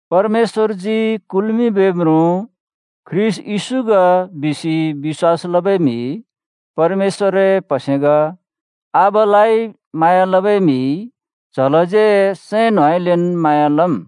“परमेश्‍वरजी कुल्‍मिंबै म्रुँ ख्रीष्‍ट येशू ग” बिसि बिश्‍वास लबै म्हि परमेश्‍वरए प्‍हसे ग, आबालाइ म्हाँया लबै म्हिइ च्हलाज्यै सैं न्होंउँइँलेन् म्हाँया लम्।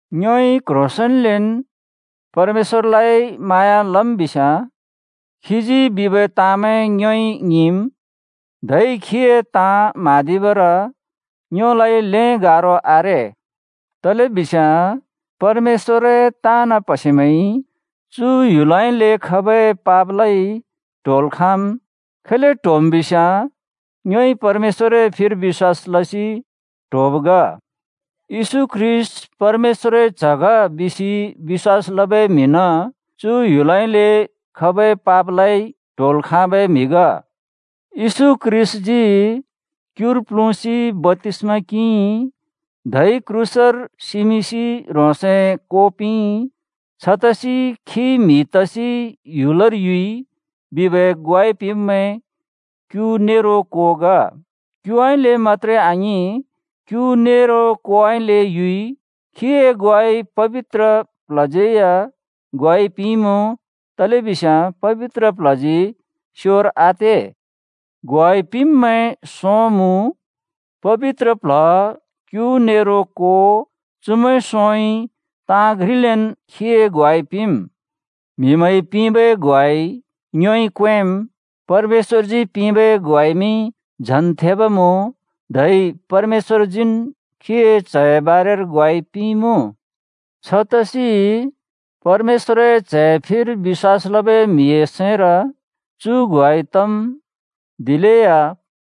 ङ्योइ क्ह्रोसेंन्लेन् परमेश्‍वरलाइ म्हाँया लम् बिस्‍याँ खीजी बिबै ताँमैं ङ्योइ ङिंम्। धै खीए ताँ म्हाँदिबर ङ्योलाइ ल्‍हें गारो आरे। तलेबिस्याँ परमेश्‍वरए ताँन् प्‍हसेमैंइ चु ह्‍युलउँइँले खबै पापलाइ ट्होल् खाँम्। खैले ट्होम् बिस्‍याँ ङ्योइ परमेश्‍वरए फिर बिश्‍वास लसि ट्होब् ग। “येशू ख्रीष्‍ट परमेश्‍वरए च्‍ह ग” बिसि बिश्‍वास लबै म्हिन् चु ह्‍युलउँइँले खबै पापलाइ ट्होल् खाँबै म्हि ग। येशू ख्रीष्‍टजी क्युर प्ल्हुँसि बप्‍तिस्‍मा किंइ, धै क्रूसर सिमिंसि ह्रोंसए को पिंइ। छतसि खी म्हि तसि ह्‍युलर युइ बिबै ग्वाइ पिंब्मैं क्यु नेरो को ग। क्युउँइँले मत्‍त्रे आङिं, क्यु नेरो कोउँइँले युइ। खीए ग्वाइ पबित्र प्ल्हज्यै या ग्वाइ पिंइमुँ, तलेबिस्याँ पबित्र प्ल्हजी स्योर आते। ग्वाइ पिंब्मैं सों मुँ: पबित्र प्ल्ह, क्‍यु नेरो को, चुमैं सोंइ ताँ घ्रिलेन् खीए ग्वाइ पिंम्। म्‍हिमैंइ पिंबै ग्वाइ ङ्योइ क्वेंम्। परमेश्‍वरजी पिंबै ग्वाइमि झन् थेब मुँ, धै परमेश्‍वरजीन् खीए च्हए बारेर ग्वाइ पिंइमुँ। छतसि परमेश्‍वरए च्‍हए फिर बिश्‍वास लबै म्हिए सैंर चु ग्वाइ तम्, दिलेया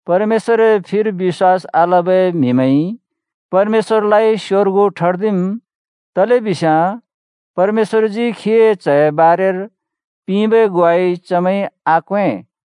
परमेश्‍वरए फिर बिश्‍वास आलबै म्हिमैंइ परमेश्‍वरलाइ स्‍योर्गु ठर्दिम्, तलेबिस्याँ परमेश्‍वरजी खीए च्‍हए बारेर पिंबै ग्वाइ चमैंइ आक्वें।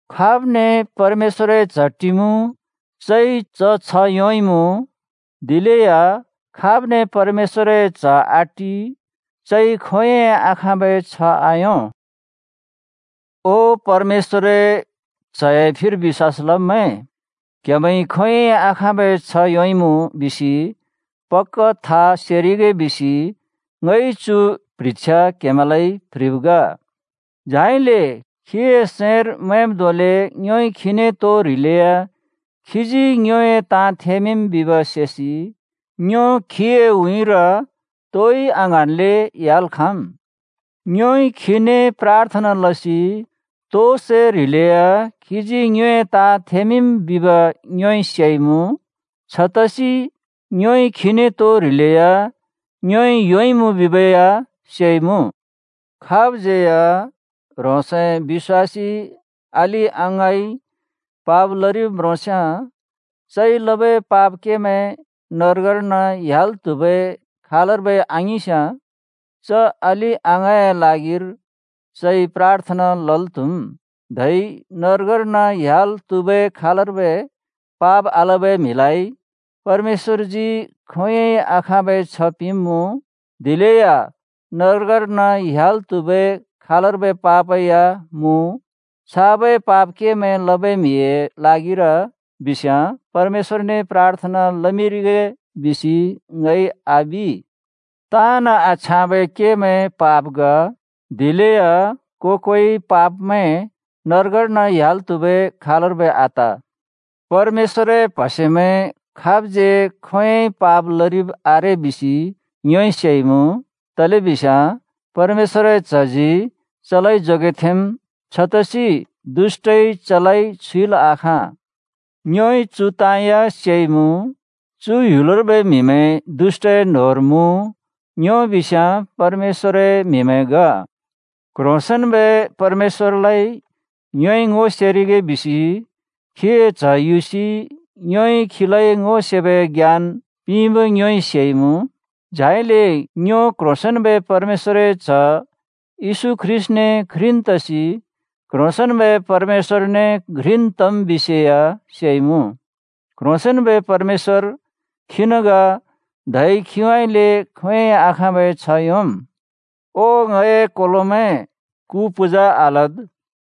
खाब्ने परमेश्‍वरए च्‍ह टिमुँ, चइ च छ्ह योंइमुँ, दिलेया खाब्ने परमेश्‍वरए च्‍ह आटि, चइ खोंयोंइ आखाँबै छ्ह आयों। ओ, परमेश्‍वरए च्‍हए फिर बिश्‍वास लब्मैं! क्‍हेमैंइ खोंयोंइ आखाँबै छ्ह योंइमुँ बिसि पक्‍का था सेरिगे बिसि ङइ चु प्ह्रिछ्या क्‍हेमैंलाइ प्‍ह्रिब् ग। झाइले खीए सैंर मैंब् धोंले ङ्योइ खीने तो ह्रिलेया खीजी ङ्योए ताँ थेमिंम् बिब् सेसि ङ्यो खीए उँइँर तोइ आङ्हाँन्ले ह्‍याल् खाँम्। ङ्योइ खीने प्राथना लसि तो सै ह्रिलेया खीजी ङ्योए ताँ थेमिंम् बिब ङ्योइ सेइमुँ। छतसि ङ्योइ खीने तो ह्रिलेया ङ्योइ योंइमुँ बिबै या सेइमुँ। खाबज्‍यै या ह्रोंसए बिश्‍वासी अलि-अङाँइ पाप लरिब् म्रोंस्‍याँ, चइ लबै पाप केमैं नर्गर्न ह्‍याल् त्हुबै खालर्बै आङिंस्‍याँ, च अलि-अङाँए ल्हागिर चइ प्राथना लल् त्‍हुम्, धै नर्गर्न ह्‍याल् त्हुबै खालर्बै पाप आलबै म्हिलाइ परमेश्‍वरजी खोंयोंइ आखाँबै छ्ह पिंब्मुँ। दिलेया नर्गर्न ह्‍याल् त्हुबै खालर्बै पाप या मुँ। छाबै पाप केमैं लबै म्हिए ल्हागिर बिस्याँ परमेश्‍वरने प्राथना लमिंरिगे बिसि ङइ आबि। ताँन् आछ्याँबै केमैं पाप ग, दिलेया को-कोइ पापमैं नर्गर्न ह्‍याल् त्हुबै खालर्बै आत। परमेश्‍वरए प्‍हसेमैं खाबज्यै खोंयोंइ पाप लरिब आरे बिसि ङ्योइ सेइमुँ, तलेबिस्याँ परमेश्‍वरए च्‍हजी चलाइ जोगेथेंम्, छतसि दुष्‍टइ चलाइ छुइल् आखाँ। ङ्योइ चु ताँ या सेइमुँ: चु ह्‍युलर्बै म्‍हिमैं दुष्‍टए न्होंर मुँ, ङ्यो बिस्याँ परमेश्‍वरए म्हिमैं ग। क्ह्रोंसेंन्‍बै परमेश्‍वरलाइ ङ्योइ ङो सेरिगे बिसि खीए च्‍ह युसि ङ्योइ खीलाइ ङो सेबै ज्ञान पिंब ङ्योइ सेइमुँ। झाइले ङ्यो क्ह्रोंसेंन्बै परमेश्‍वरए च्‍ह येशू ख्रीष्‍टने घ्रिन् तसि क्ह्रोंसेंन्‍बै परमेश्‍वरने घ्रिन् तम् बिसे या सेइमुँ। क्ह्रोंसेंन्‍बै परमेश्‍वर खीन् ग धै खीउँइँले खोंयोंइ आखाँबै छ्ह योंम्। ओ ङए कोलोमैं, कु पूजा आलद्।